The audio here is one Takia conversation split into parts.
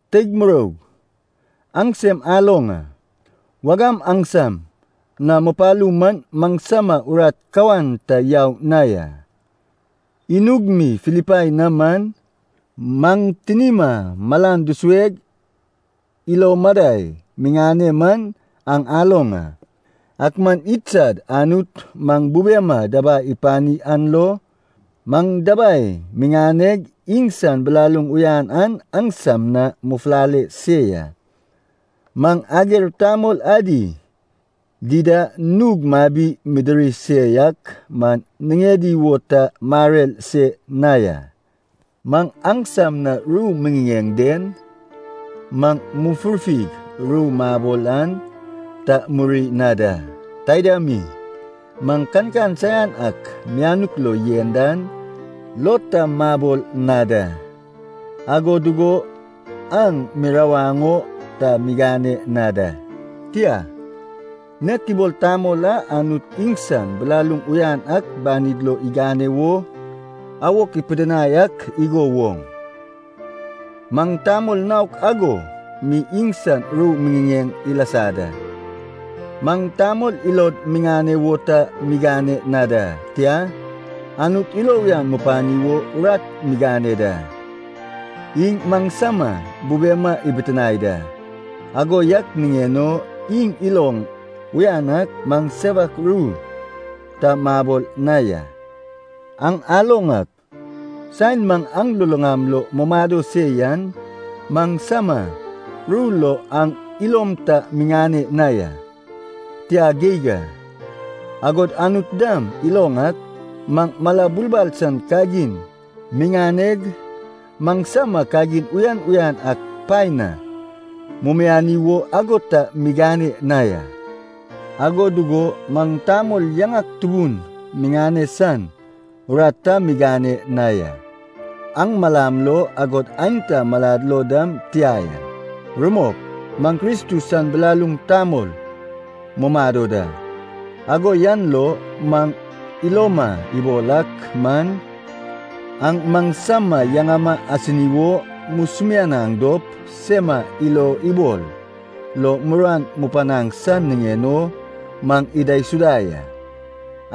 Teig muroug, aŋsem aloŋ a, wagam aŋsam na mupalu man maŋsama urat kawan ta yau na ya. Inug mi Filipai na man, maŋ tinima malan dusueg ilo madai miŋane man aŋ aloŋ a. Ak man idsad Anut maŋ bubema dabai ipani an lo, maŋ dabai miŋaneg iŋsan bilaluŋ uyan an aŋsam na mufulale se ya. Maŋ ager tamol adi dida nug mabi midiri se yak man niŋedi wo ta marer se na ya. Maŋ aŋsam na ru miŋiŋeŋ den, maŋ mufurfig ru mabol an ta muri na da. Taida mi, maŋ kankan saian ak mianuk lo yen dan lo ta mabol na da, ago dugo aŋ mirawaŋ o ta migane na da. Tia, nek ibol tamol a Anut iŋsan bilaluŋ uyan ak banid lo igane wo awok ipidinai ak igo woŋ, maŋ tamol naok ago mi iŋsan ru miŋiŋeŋ ilasa da. Maŋ tamol ilod miŋane wo ta migane na da, tia, Anut ilo uyan mupani wo urat migane da. Iŋ maŋsama bubema ibitinae da, ago yak niŋen o iŋ iloŋ uyan ak maŋ sewak ru ta mabol na ya. Aŋ aloŋ ak, saen maŋ aŋ luluŋam lo mumado se yan, maŋsama ru lo aŋ ilom ta miŋane na ya, tia geig a. Agod Anut dam iloŋ ak, maŋ mala bulbal san kagin miŋaneg, maŋsama kagin uyan uyan ak paen na mumiani wo ago ta migane na ya. Ago dugo, maŋ tamol yaŋak tubun miŋane san urat ta migane na ya. Aŋ malam lo, agod aenta malad lo dam tia ya. Rumok, maŋ Kristus san bilaluŋ tamol mumado da. Ago yan lo maŋ iloma ibol ak man, aŋ maŋsama yaŋama asini wo musumianaŋ dop sema ilobol lo muruan mupanaŋ san niŋen o maŋ idaisuda ya.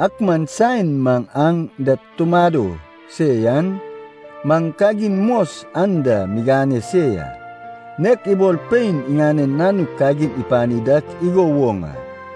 Ak man saen maŋ aŋ da tumado se yan, maŋ kagin mos anda migane se ya, nek ibol pein iŋanen nanuk kagin ipani dak igo woŋ a.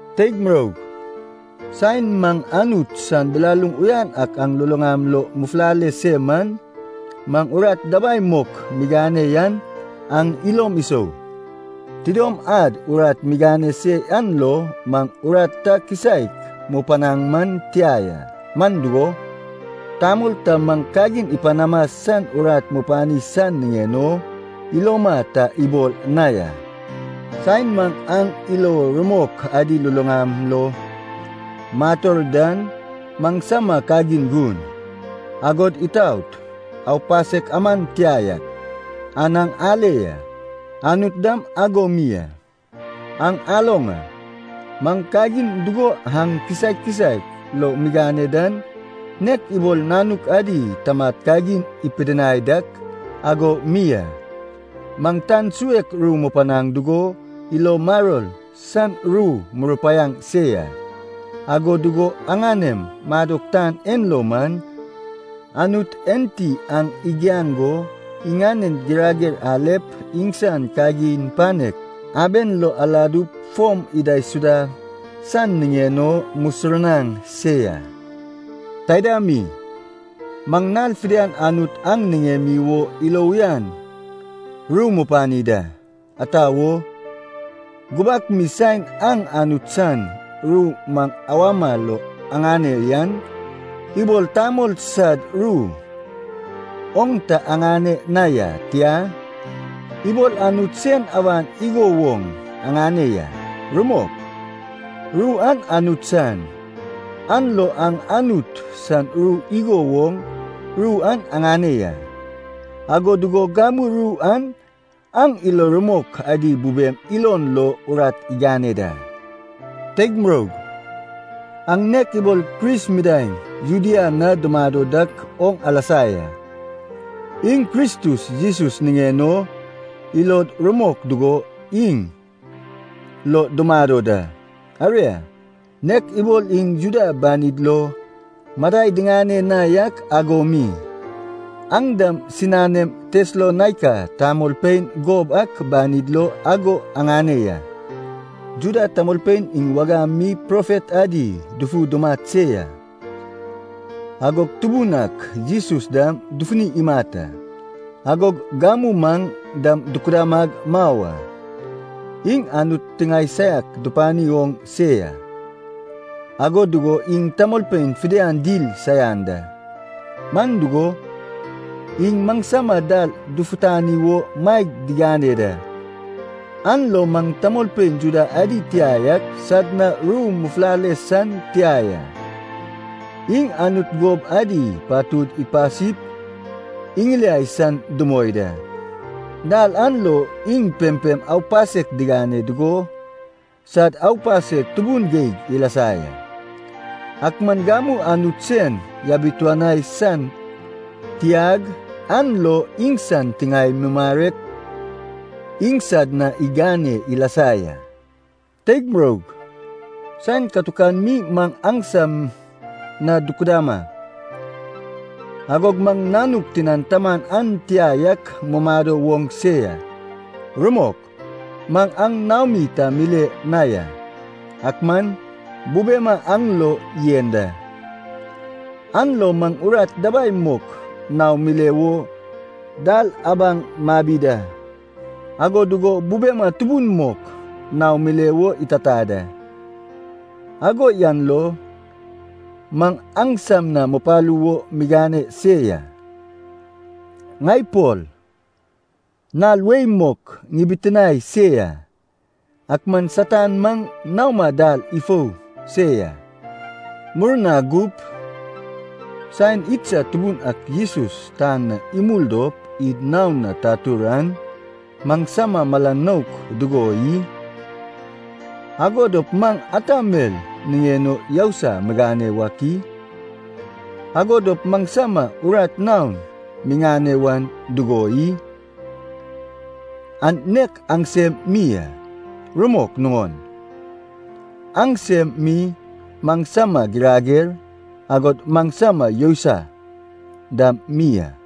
Teig muroug, saen maŋ Anut san bilaluŋ uyan ak aŋ luluŋam lo mufulale se man, maŋ urat dabai mok migane yan aŋ ilom isou. Tidom ad urat migane se yan lo maŋ muruan ta kisaek mupanaŋ man tia ya. Man dugo, tamol ta maŋ kagin ipanama san urat mupani san niŋen o iloma ta ibol na ya. Saen maŋ aŋ ilo rumok adi luluŋam lo mator dan maŋsama kagin gun, agod itaot, aupasek aman tia yak, an aŋ ale ya. Anut dam ago mi a. Aŋ aloŋ a, maŋ kagin dugo aŋ kisaek kisaek lo migane dan, nek ibol nanuk adi tamad kagin ipidinai dak ago mi a. Maŋ tan suek ru mupanaŋ dugo, ilo maror san ru murupaiaŋ se ya. Ago dugo aŋanem madok tan en lo man, Anut enti aŋ igiaŋ go iŋanen girager alep iŋsan kagin panek aben lo aladup fom idaisuda san niŋen o musurnaŋ se ya. Taida mi, maŋ nal fidian Anut an niŋemi wo ilo uyan ru mupani da. Ata wo? Gubak mi saen aŋ Anut san ru maŋ awama lo aŋane yan, ibol tamol sad ru oŋ ta aŋane na ya, tia, ibol Anut sen awan igo woŋ aŋane ya. Rumok, ru an Anut san, an lo aŋ Anut san ru igo woŋ ru an aŋane ya. Ago dugo gamu ru an aŋ ilo rumok adi bubem ilon lo urat igane da. Teig muroug, aŋ nek ibol Kris midaeŋ Judea na dumado dak oŋ alasa ya. Iŋ Kristus Jesus niŋen o ilod rumok dugo iŋ lo dumado da. Aria, nek ibol iŋ Juda banid lo madai diŋane na yak ago mi, aŋ dam siŋanem Tesalonaika tamolpein gob ak banid lo ago aŋane ya. Juda tamolpein iŋ wagam mi profet adi dufu dumat se ya, agog Tubun ak Jesus dam dufuni imat a, agog gamu maŋ dam dukudamag mau a. Iŋ Anut tiŋae saiak dupani oŋ se ya, ago dugo iŋ tamolpein fidian dil saian da. Man dugo, iŋ maŋsama dal dufutani wo maeg digane da, an lo maŋ tamolpein Juda adi tia yak sad na ru mufulale san tia ya. Iŋ Anut gob adi patud ipasip iŋiliai san dumoi da. Dal an lo iŋ pempem aupasek digane dugo sad aupasek tubun geig ilasa ya. Ak man gamu Anut sen yabituani san tiag an lo iŋsan tiŋae mumarek iŋsad na igane ilasa ya. Teig muroug, saen katukan mi maŋ aŋsam na dukudama, agog maŋ nanuk tinan taman an tia yak mumado woŋ se ya. Rumok maŋ aŋ naomi ta mile na ya, ak man bubema aŋ lo yen da. An lo maŋ urat dabai mok naom mile wo dal abaŋ mabi da, ago dugo bubema tubun mok naom mile wo itata da. Ago yan lo maŋ aŋsam na mupalu wo migane se ya, ŋai Pol nal wei mok ŋibitinae se ya. Ak man Satan maŋ naoma dal ifou se ya. Murna gup, saen idsad Tubun ak Jesus tan na imul dop id naon na tatur an, maŋsama mala nouk dugo i? Ago dop maŋ ata mel niŋen o yousai migane wak i? Ago dop maŋsama urat naon miŋane wan dugo i? An nek aŋsem mi a. Rumok nuŋon, aŋsem mi maŋsama girager, agod maŋsama yousai dam mi a.